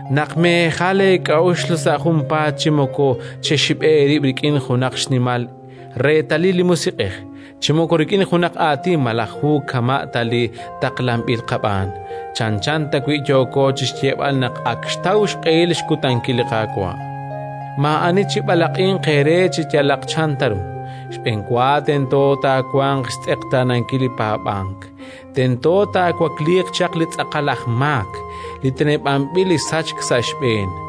naq meejal eek'a'uxl sa' junpaat chi moko chexib'e eerib' rik'in junaq xnimal reetalil li Musiq'ej, chi moko rik'in junaq aatin malaj hu kama' ta li taqlanb'il qab'aan, chanchan tawi' yooko chi xyeeb'al naq ak xtaw xq'ehil xkutankil li Qaawa'. Maa'ani chib'alaq'inq eere chi yalaq chan ta ru. Xb'enwa tento taawanq xtz'eqtaanankil li paab'ank; tento taawakliiq chaq li tz'aqal aj maak, li teneb'anb'il li sachk sa' xb'een,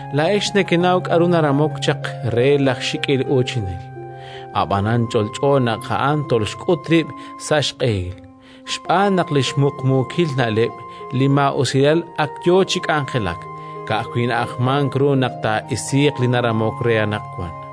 Laa'ex nekenaw k'aru naramok chaq re laj xik'il uuchinel; ab'anan ch'olch'o naq a'an tolxk'ut rib' sa' xq'ehil. Xb'aan naq li xmuqmuukil na'leb' li maa'usilal ak yo chi k'anjelak; ka'ajwi' na'ajmank ru naq taa'isiiq li naramok re anaqwan.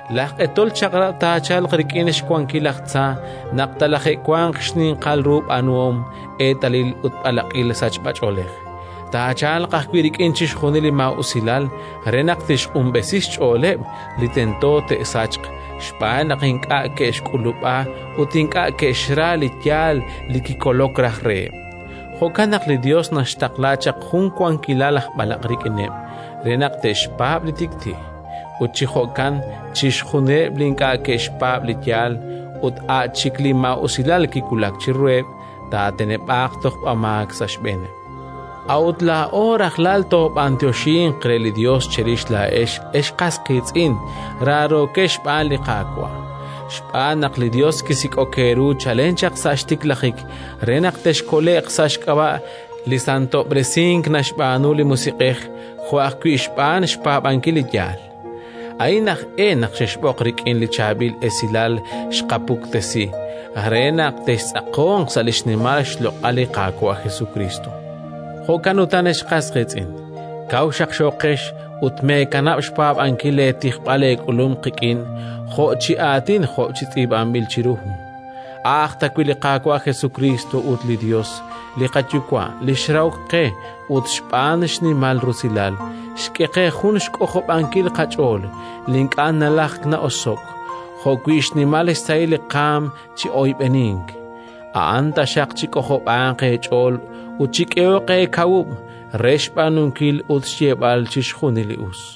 Laj q'etol chaq'rab' taachalq rik'in xwankil laj tza naq talaje'wanq xninqal ru b'aanuhom, eetalil ut b'alaq'il sachb'ach'oolej; taachalq ajwi' rik'in chixjunil li maa'usilal re naq tixq'unb'esi xch'ooleb' li tento te'sachq xb'aan naq ink'a' ke'xk'ulub'a ut ink'a' ke'xra li yaal li kikolok raj reheb'. Jo'kan naq li Yos naxtaqla chaq jun wankilal aj b'alaq' rik'ineb' re naq te'xpaab' li tik'ti', ut chi jo'kan chixjunileb' li ink'a' ke'xpaab' li yaal ut a' chik li maa'usilal kiwulak chiruheb', taateneb'aaq tojb'amaak sa' xb'eeneb'. A'ut laa'o rajlal toob'anyoxinq re li Yos cherix laa'ex, ex qas qiitz'in raarookex xb'aan li Qaawa', xb'aan naq li Yos kisik'ok eeru chalen chaq sa' xtiklajik re naq texkole'q sa' xk'ab'a' li santob'resink naxb'aanu li Musiq'ej, jo' ajwi' xb'aan xpaab'ankil li yaal. A'in aj e naq xexb'oq rik'in li Chaab'il Esilal xqapuktesi, re naq textz'aqonq sa' li xnimal xloq'al li Qaawa' Jesukriist. Jo'kan utan, ex qas qiitz'in, kaw xaqxooqex ut meekanab' xpaab'ankil leetijb'al eek'ulum qik'in jo' chi aatin jo' chi tz'iib'anb'il chiru hu. A'aj tawi' li Qaawa' Jesukriist ut li Yos li qaYuwa', li xrahok qe ut, xb'aan xnimal rusilal, xk'e qe jun xk'ojob'ankil qach'ool li ink'a' nalajk na'oso'k jo'wi' xnimal xsahil li qaanm chi oyb'enink, a'an taxaq chik'ojob'anq eech'ool ut chik'ehoq eekawub' re xb'aanunkil ut xyeeb'al chixjunil li us.